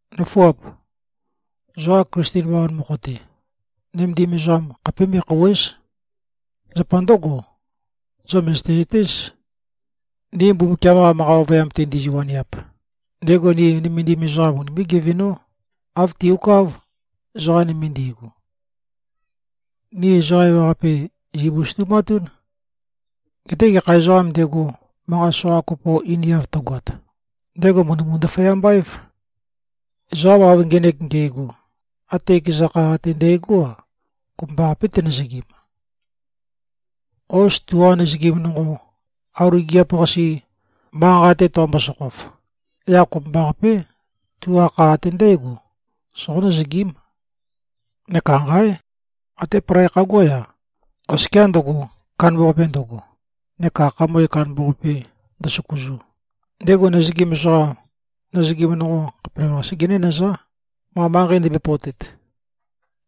Nǿfuap! Zoqa Klisten bawan mokho-te, nømendim ezoqam khapé me꞉khòuwe᷄z. Zapa ndǿgo, zo mø̀zøte-zøtéz. Ni Mbumbukiam-qa manqa ovøyam-te ndizi-waniap, ndego ni nømendim ezoqam unimé꞉-gevenó, āv tiuká, ezoqa nøme ndigu. Ni ezoqa ewaqape, zìbusøtumatún. Geté gekha ezoqām ndego, manqat soqa kopo einiav tøgoat, ndego mø̀ndømu-ndaføyamba-év. Ezoqam av ngenek nge꞉go, até ekeza kha ate ndægó-a, kopømbaqapé, tenøzøgim. Hos, tuqa nøzøgim nonqo, auli gigiap-qase, manqa-nqa-te toqombo-sokhof, yaq kopømbaqapé, tuqa kha ate ndǽgo soqó-nøzøgím. Neka nqáe! Até palai khaguá-ya, oskiá ndøgo, kandambaqape ndøgo, neka khamøe kandambaqape ndøsøkuzu, ndego nøzøgim ezoqam, nøzøgim nonqo khapelavøqasé genénøzá, ma manqei ndømbøe-pøotet.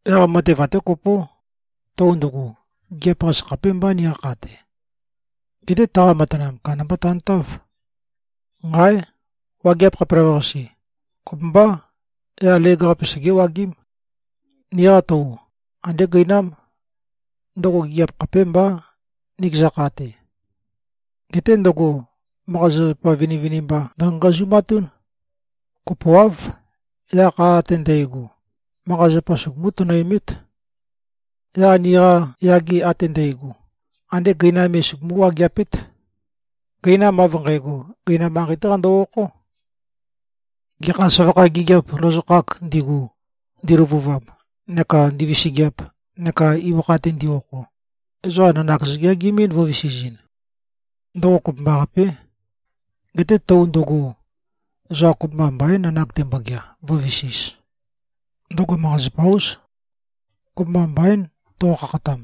Yaq matev até kopó. Tou ndøgo, gigiap-qase khapémbá, niqa kha-te. Geté taqa matanam, kandambá tantáv. Nqáe! Wageap khapelavøqase, kopømbá, yaq leg-qape segéwagím. Niqa tou, andé gøinám. Ndøgo gigiap khapémbá, nikeza kha-te. Geté ndøgo manqa-zapazapa vinivinimba ndøngazungazumatún. Kopoáv. Yaq kha ate ndægo, manqa-zapa sugumú-tønøemét. Yaq niqa yage ate ndægo, andé gøinam me sugumú-wageapét. Gøinam av nqægo, gøinam manqei-té qando-okhó. Gekha søvakha gigiap lozokhāk ndigu, ndiløvuvam neka ndivisigiap neka ibøkha-te ndi-okho, ezoqa nanak zøgeagimín, vø̄visizin. Ndøgo kopømbaqapé. Geté tou ndøgo, ezoqa kopømba mbaín, nanak tembogea, vǿvisīz. Ndøgo manqa-zapa-ús. Kopømba mbaín, toqo-khakhatam.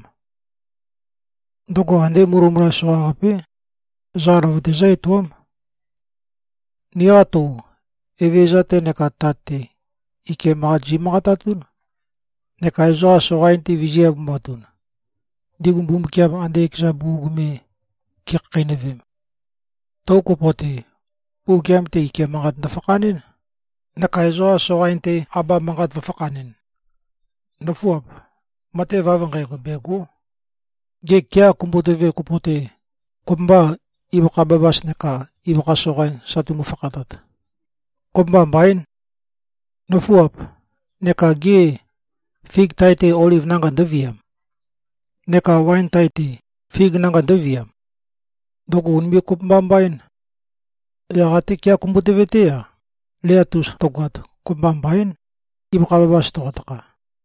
Ndøgo andé mulømula soqaqapé. Ezoqa løvøte zǿ-etoám. Niqa tou, Evezøza-te neka Tat-te, ike manqat zi꞉manqatatún, neka ezoqam soqain-te vizī꞉-abumatun, ndigu Mbumbukiam ande ekeza bugug me ge꞉khakheinøvem. Tou kopo-te, Mbumbukiam-te ike manqat ndøfakhanɨ́n neka ezoqa soqain-te abam manqat vø̄fakhanɨn. Nǿfuap! Matev av nqægo, bègo᷄. Gê, kea kumbutøve kopo-te, kopømbâ, ibøkha bæbæs neka ibøkha soqain sa tumu-fakhatat? Kopømba mbaín. Nǿfuap! Neka gê, fig tae-te, oliv nanga ndǿviam? Neka waen tae-te, fig nanga ndǿviam? Ndøgo ùnime꞉-kopømba-mbaín. Yaq até kea kumbutøve-té-a, leat-us tøgoat, kopømba mbaín, ibøkha bæbæs toqotakha.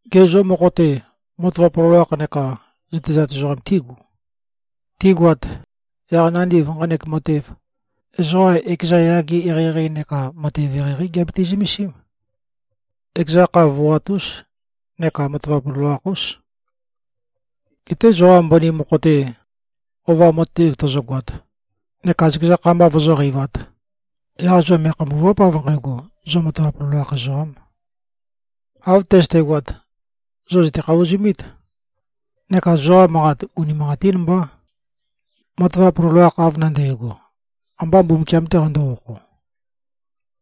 Gê, zo mokho-te, matavap loloakh neka zøtezat ezoqam tígu? Tigoat, yaq nandiv nqanek matev, ezoqa ekeza yage eqeieqei neka matev eqeieqeí giabiti-zømesím. Ekeza kha voat-ús neka matavap loloakh-ús. Geté zoqa mbøni mokho-te, ova matev tøzøgoat neka zøkeza kha mba vozóqeivāt, yaq zo me꞉khambùva᷄p, av nqægo, zo matavap loloakh ezoqām. Av tøzøtegoat, zo zø̀te-khavozumít neka zoqa manqat, unimanqatín mbá. Matavap loloakh av nandægo, ambā Mbumbukiam-tē qandō-okho.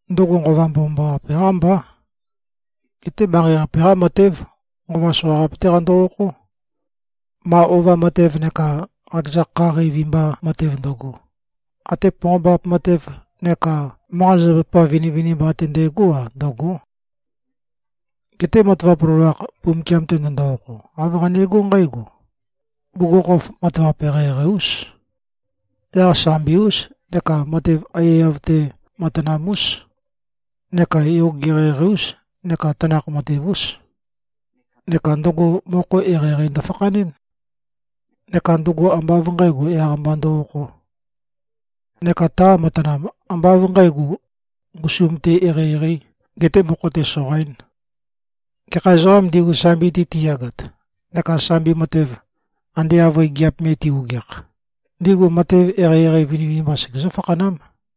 Ndøgo Nqova Mbomambaqape-qá mbá. Geté manqei-qape-qá matév. Nqova soqaqape-té qando-okhó. Ma ova matev neka qakeza kha qeivi mba matev ndøgo, até ponqombap matev neka manqa-zapazapa vinivinimba ate ndægó-a, ndø̂gó. Geté matavap loloakh, Mbumbukiam-te ndøndo-okho, āv qanegó nqǽgo: Bugukhokhof matavap eqeieqei-ús. Yaq sambi-ús neka matev aiyaiyav-te matanam-ús neka yoge eqeieqei-ús neka tanakh-matev-ús. Neka ndøgo mokho eqeieqei ndøfakhanɨ́n. Neka ndøgo ambá av nqǣgo, yaq-mba ndø-okhō. Neka taqa matanam, ambá av nqǣgo, ngusum-te eqeieqeī, getē mokho-te soqaīn. Gekha ezoqām ndigu, sambi-te tiyagat neka sambi matev ande avøe gigiap me ti꞉-ogeakh, ndigu matev eqeieqei vinivinimba segezǿ-fakhanám.